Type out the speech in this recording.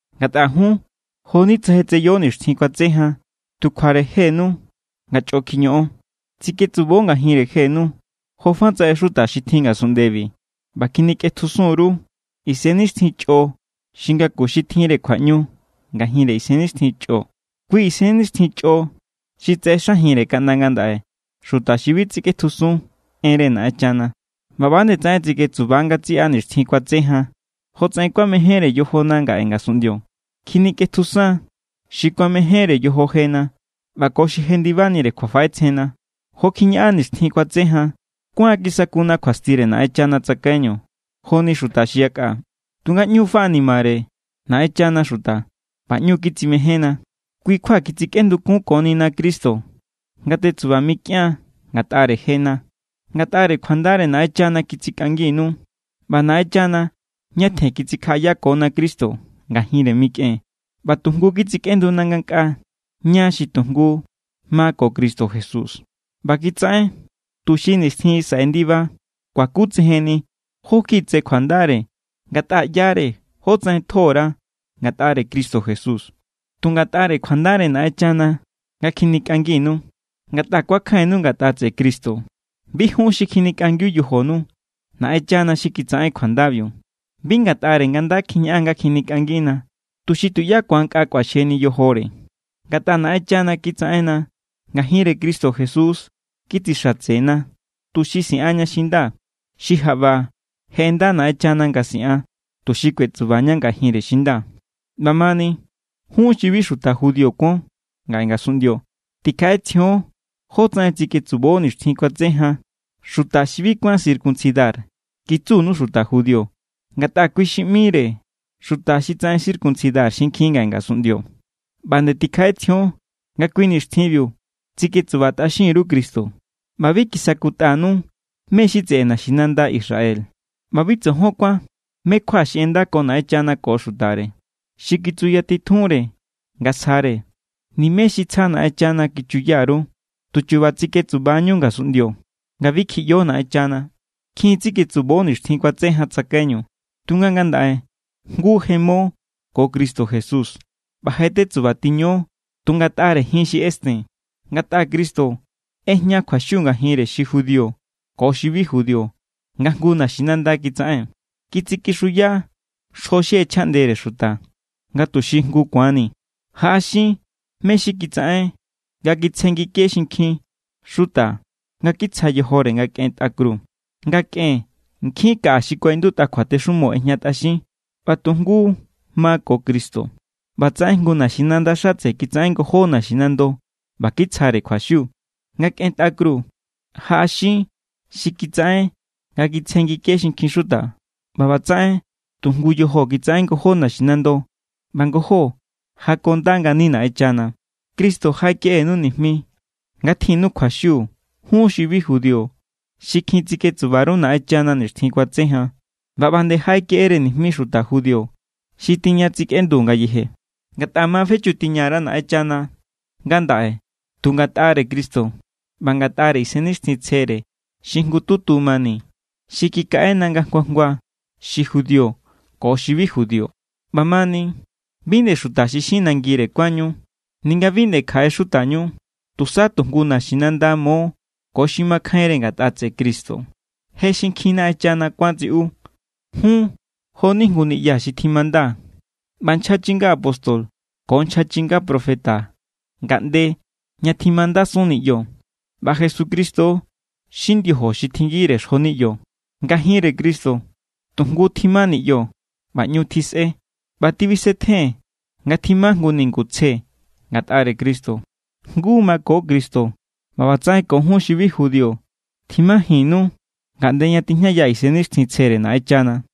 Ngatꞌa jun, jo=ni tsa je tseyo nixtjin kuatse jan tu kjuare jenu nga chꞌo kjiñoꞌon. Tsiketsubo ngajinre jenu, jofatsaꞌen xuta xi tjin ngasunꞌndebi ꞌba kjinikꞌetjusun_ru isennixtjin chꞌo xi ngaku xi tjinre kjuaꞌñu ngajinre isennixtjin chꞌo. Kui isennixtjin chꞌo xi tsaꞌexajinre kaꞌnda ngandaꞌe xuta xi bi tsikꞌetjusun enre Naꞌenchana. ꞌBa ꞌba nde tsaꞌen tsiketsuba ngatsiꞌa nixtjin kuatse jan, jotsaꞌen kuamejénre yojona ngaꞌe ngasunꞌndio. Kjinikꞌetjusan xi kuamejénre yojo jena ꞌba ko xi jendibanire kjuafaꞌetsjenna. Jo kjiñaꞌan nixtjin kuatse jan, kuáan kisakuna kjuastire Naꞌenchana tsakaiñu joni xuta xi yakꞌa. Tunga ꞌñu= faꞌanimare Naꞌenchana xuta ꞌba ꞌñu= kitsimejénna. Kui kjua kitsikꞌendukunkonina Cristo nga tetsuba mikꞌian ngatꞌare jena. Ngatꞌare kjuandare Naꞌenchana kitsikꞌanginu. ꞌBa Naꞌenchana ñatjen kitsikjaꞌayakona Cristo ngajinre mikꞌen ꞌba tu jngu kitsikꞌenduna ngankꞌaa ña xi tu jngu ma ko Cristo Jesús. ꞌBa kitsaꞌen tuxi nixtjin xi saꞌe ndiba kuakutsejenni jó kjiꞌi tse kjuandare ngatꞌa ꞌyare jótsaꞌen tjo_ra ngatꞌare Cristo Jesús. Tu ngatꞌare kjuandare Naꞌenchana nga kjinikꞌanginu, ngatꞌa kuakjainnu ngatꞌa tseꞌe Cristo. Bi jun xi kjinikꞌangiu yojonu, Naꞌenchana xi kitsaꞌen kjuandabiu. Bi ngatꞌare nga nda kjiñaꞌan nga kjinikꞌangina, tuxi tuꞌyá ku̱an nkꞌa kꞌuaxjeni yojore. Ngatꞌa Naꞌenchana kitsaꞌenna. Ngajinre Cristo Jesús kitsixatsena, tuxi siꞌanña xi nda, xi jaꞌba je ꞌenda Naꞌenchana nga siꞌan, tuxi kuetsubaña ngajinre xi nda. ꞌBamani, jun xi bi xuta judío kuon ngaꞌe ngasunꞌndio, tikjaꞌetsjion jótsaꞌen tsiketsubo nixtjin kuatse jan. “Xuta xi bi kuán circuncidar”, kitsunu xuta judío, ngatꞌa kui xi ꞌmire xuta xi tsaꞌen circuncidar xinkjin ngaꞌe ngasunꞌndio. ꞌBa nde tikjaꞌetsjion nga kui nixtjinbiu tsiketsubatꞌaxin_ru Cristo, ꞌba bi kisakutꞌanu mé= xi tseꞌe naxinanda Israel. ꞌBa bi tsojon kuán mé= kjua xi ꞌendako Naꞌenchana ko xutare, xi kitsuyatitjunre nga sjare. Nimé xi tsja Naꞌenchana kichuya_ru. Tu chu̱ba̱ tsiketsuba=ñú ngasunꞌndio nga bi kjiꞌyo Naꞌenchana. Kjin tsiketsubo nixtjin kuatse jan tsakaiñu, tunga ngandaꞌe jngu je mo ko Cristo Jesús ꞌba je tetsubatiño tu ngatꞌare jin xi ꞌesten. Ngatꞌa Cristo ꞌejña kjuaxiu ngajinre xi judío ko xi bi judío nga jngu naxinanda kitsaꞌen. Kitsikixuya xjo xi ꞌechjaꞌndere xuta, nga tuxi jngu ku̱anni. Jaꞌaxin mé= xi kitsaꞌen nga kitsjenngike xinkjin xuta nga kitsja yojore nga kꞌen tꞌa kru. Nga kꞌen, nkjin kaꞌa xi kuaꞌindutꞌa kjuatexumo ꞌejñatꞌaxin=. ꞌBa nga tu jngu ma ko Cristo, ꞌbatsaꞌen jngu naxinanda xatse kitsaꞌen ngojó naxinando ꞌba kitsjare kjuaxiu. Nga kꞌen tꞌa kru, jaꞌaxin xi kitsaꞌen nga kitsjenngike xinkjin xuta. ꞌBa ꞌbatsaꞌen tu jngu yojo kitsaꞌen ngojó naxinando ꞌba ngojó jakonda ngani Naꞌenchana. Cristo jaꞌekeꞌenu nijmi nga tjinnu kjuaxiu jun xi bi judío xi kjin tsiketsuba_ru Naꞌenchana nixtjin kuatse jan. ꞌBa ꞌba nde jaꞌekeꞌere nijmi xuta judío xi tiña tsikꞌendu ngayeje. Ngatꞌa ma fechutꞌatiña_ra Naꞌenchana ngandaꞌe tu ngatꞌare Cristo ꞌba ngatꞌare Isennixtjintsjere xi jngututu mani xi kikaꞌena nga jngua jngua, xi judío ko xi bi judío. ꞌBamani, bi nde xuta xi xin nangire kuánñu ninga bi nde kjaꞌe xutañu. Tusa tu jngu naxinanda mo ko xi makjainre ngatꞌa tseꞌe Cristo. Je xinkjin Naꞌenchana kuán tsiꞌu. Jun jo=ni jngu niꞌya xi tjimanda. ꞌBa nchja chinga apóstol ko nchja chinga profeta ngaꞌnde ña tjimandasun niꞌyo. ꞌBa Jesucristo= xi ndiojo xi tjinngire xjo niꞌyo. Ngajinre Cristo tu jngu tjima niꞌyo ꞌba ꞌñu tjisꞌe. ꞌBa tibisetjen nga tjima jngu ningu tsje ngatꞌare Cristo. Jngu mako Cristo ꞌba ꞌbatsaꞌen ko jun xi bi judío tjimajinnu ngaꞌnde ña tijñaya Isennixtjintsjere Naꞌenchana.